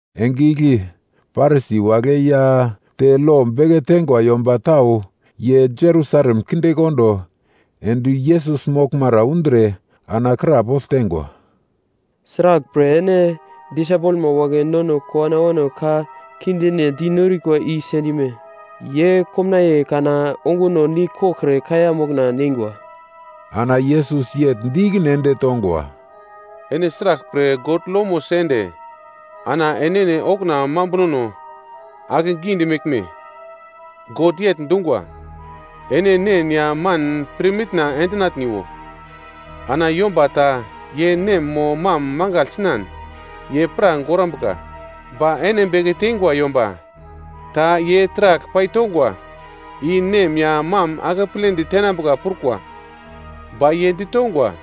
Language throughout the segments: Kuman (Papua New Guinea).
Enge igle Parisi wagle ya te lo beke teingwa yomba tau ye Jerusalem kindekondo ende Yesus moglmara undre ana krapogl teingwa, “Sraglpre ene disaipelma wagle nono kowano awano ka kindine di norikwa i sendime? Ye komnaiye kana onguno nigl koglkre kaiya mokna neingwa!” Ana Yesus yegl di ikine ende tongwa, “Ene sraglpre God lomo sende ana enene okuna mambunono akegidi meglme? God yegl dungwa, ‘Ene nen ya man pirmitna endinatniwo.’ Ana, ‘Yomba ta ye nem mo mam mangagl sinan, ye pra gorambuka.’ Ba ene beke teingwa, yomba ta ye taragl paitongwa, i nem ya mam akepledi tenambuka prukwa. Ba ye ditongwa,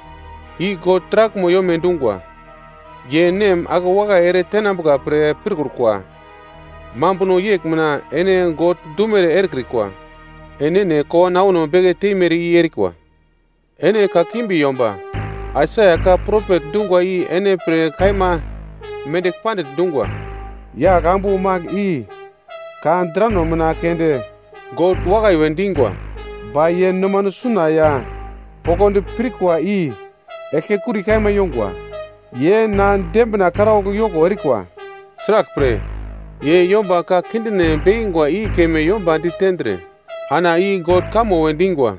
‘I God taraglmo yome dungwa.’ Ye nem akewakai ere tenambuka pre pirkrukwa. Mambuno yegl mina ene God dumere erekrikwa. Enene kowano awano beke teimere i erikwa. Ene kakimbi yomba! Aisaia ka propet dungwa i ene pre kaima mendigl pandigl dungwa: “‘Yaglambu magl i ka drano mina keunde God wakai we dingwa, ba ye nomano suna ya poglodi pirkwa i eglkekuri kaima yongwa. Ye na dembina karaugl yoko erikwa. Sraglpre, ye yomba ka kindine bekingwa i keme yomba ditendre ana i God kamo we dingwa.’”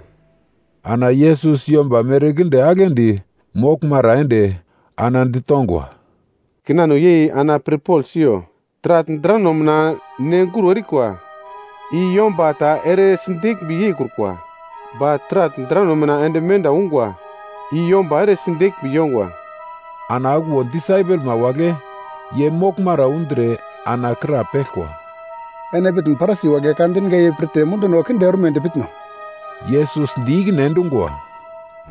Ana Yesus yomba merkinde aglendi moglmara ende, ana ditongwa, “Kinano yei ana pirpogl siyo. Taragl drano mina nenguro erikwa, i yomba ta ere sideglmbi yeikrukwa. Ba taragl drano mina ende menda ungwa i yomba ere sideglmbi yongwa.” Ana okuwo disaipelma wagle ye moglmara undre ana krapeglkwa, “Ene pitn Parisi wagle ka dinga i pirtre munduno kinde ormedi pitno?” Yesus di ikine endungwa,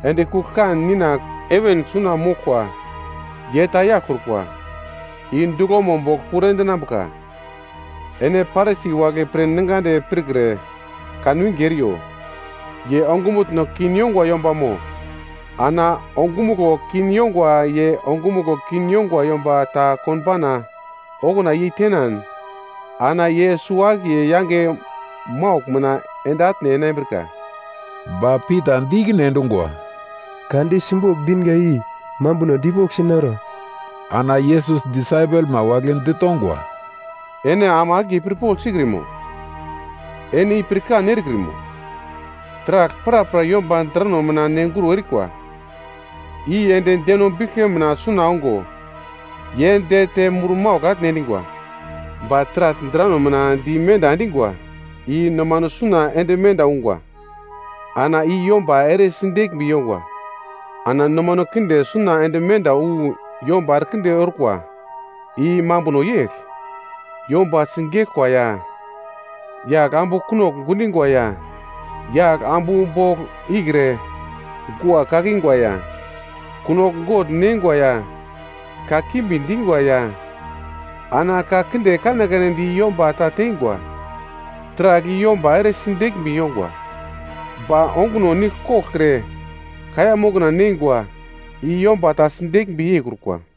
“Endi kugl-kan Nina heven suna moglkwa ye ta yaglkrukwa, i duglomo bogl puro endinambuka. Ene Parisi wagle pre ningadi pirkre kanwinge eriyo, ye ongumutno kin yongwa yombamo. Ana ongumuglo kin yongwa ye ongumuglo kin yongwa yomba ta konbauna okuna yeitenan, ana ye suwo-akiye yange maugl mina ende atne enambrika.” Ba Pita di ikine endungwa, “Ka di simbogl dinga i mambuno dipoglsi noro?” Ana Yesus disaipelma wagle ditongwa, “Ene ama akiye pirpogl sikrimo? Ene i pirkan erekrimo? Taragl prapra yomba drano mina nenguro erikwa, i ende deno biglke mina suna ongo ye dete murmaugl atne endingwa. Ba taragl drano mina di menda endingwa, i nomano suna ende menda ungwa. Ana i yomba ere sideglmbi yongwa. Ana nomano kinde suna ende menda wu yomba erekinde orkwa, i mambuno yegl. Yomba sigeglkwa ya, yagl ambu kunogl gundingwa ya yagl ambu bogl ikre gua kakingwa ya, kunogl gogl neingwa ya, kakimbi dingwa ya, ana ka kinde kanekane di yomba ta teingwa. Taragl i yomba ere sideglmbi yongwa. Ba onguno nigl koglkre kaiya mokna neingwa, i yomba ta sideglmbi yeikrukwa.”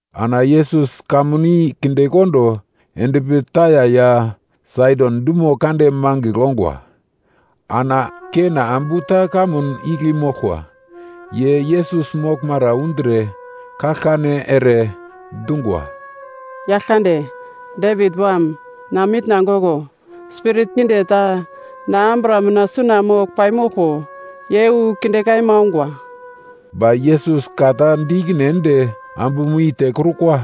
Ana Yesus kamun i kindekondo endpi Taia ya Saidon dumo kande mangigl ongwa. Ana Kena ambu ta kamun igle moglkwa, ye Yesus moglmara undre kaglkane ere dungwa, “Yaglkande, Devit Wam, na mitna goglo. Spirit kinde ta na ambura mina suna mogl paimoglko, ye wu kinde kaima ongwa.” Ba Yesus ka ta di ikine ende ambumo i tekrukwa.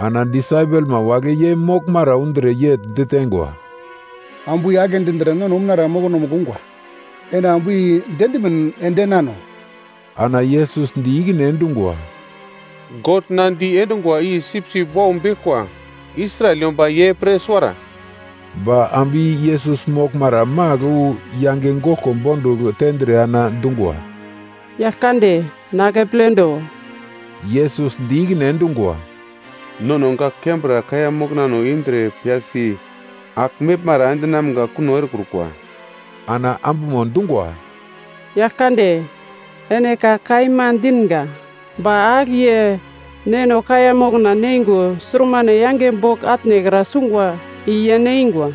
Ana disaipelma wagle ye moglmara undre yegl diteingwa, “Ambu i agle dindre nono umunara mokonomugl ungwa, ene ambu i diendimin ende enano.” Ana Yesus di ikine endungwa, “God na di endungwa i sipsip wau beglkwa, Israel yomba ye pre suwara.” Ba ambu i Yesus moglmara magl wu yange goglko bondugl tendre ana dungwa, “Yaglkande, na akepledo.” Yesus di ikine endungwa, “Nono gak kembra kaiya moknano indre piyasi agl meglmara endinamga kuno erekrukwa.” Ana ambumo dungwa, “Yaglkande, ene ka kaima dinga. Ba agl ye neno kaiya mokna neingo surmane yange bogl atnekra sungwa i ye neingwa.”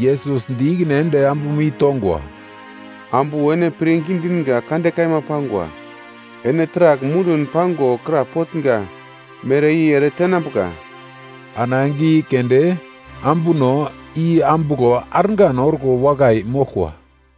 Yesus di ikine ende ambumo i tongwa, “Ambu ene pirngi dinga kande kaima pangwa. Ene taragl mundun pango krapotnga mere i ere tenambuka.” Ana enge i keunde ambuno i ambuglo argan orko wakai moglkwa.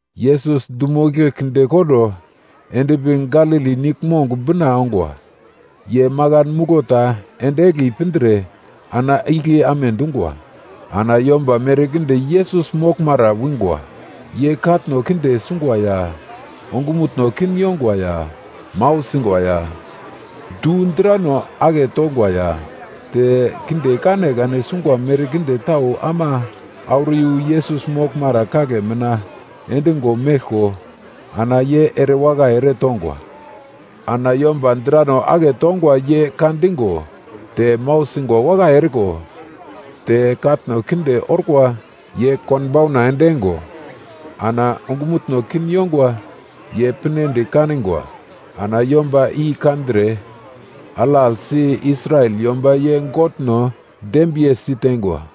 Yesus dumo igle kindekondo endpi Galili niglmong bina ongwa. Ye makan muglo ta ende egli pindre ana igle amedungwa. Ana yomba merkinde Yesus moglmara wingwa. Ye katno kinde sungwa ya, ongumutno kin yongwa ya, mau singwa ya, du drano aketongwa ya, te kinde kanekane sungwa merkinde tau ama auro iyu Yesus moglmara kagle mina endigo meglko ana ye erewakai eretongwa. Ana yomba drano aketongwa ye ka digo, te mau singwa wakai eriko, te katno kinde orkwa ye konbauna endeingo, ana ongumutno kin yongwa ye pinedi kanigwa. Ana yomba i kandre alaglsi Israel yomba ye Godno dembiye siteingwa.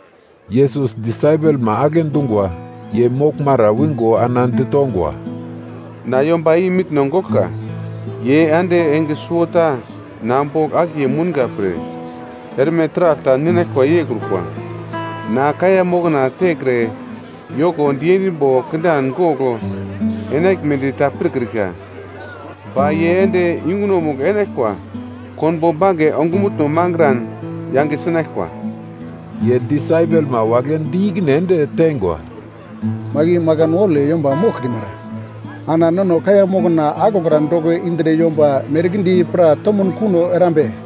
Yesus disaipelma agle dungwa ye moglmara wingo ana ditongwa, “Na yomba i mitno goglka. Ye ande enge suwota na bogl akiye mounga pre, erme taragl ta ninaglkwa yeikrukwa. Na kaiya mokna tekre yoko diendimbo kindan gogl enaglmedi ta pirkrika. Ba ye ende yungunomugl enaglkwa konbo bange ongumutno mangran yange sinaglkwa.” Ye disaipelma wagle di ikine ende teingwa, “Magl i makan waule yomba moglkrimara, ana nono kaiya mokna aglokra doko indre yomba merkinde i pra tomuno kuno erambe?”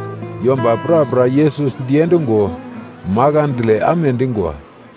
Yomba prapra Yesus diendungo makandle amedingwa.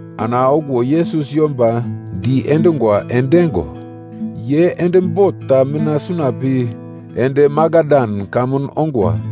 Ana okuwo Yesus yomba diendungwa endeingo, ye ende bot ta mina suna pi ende Magadan kamun ongwa.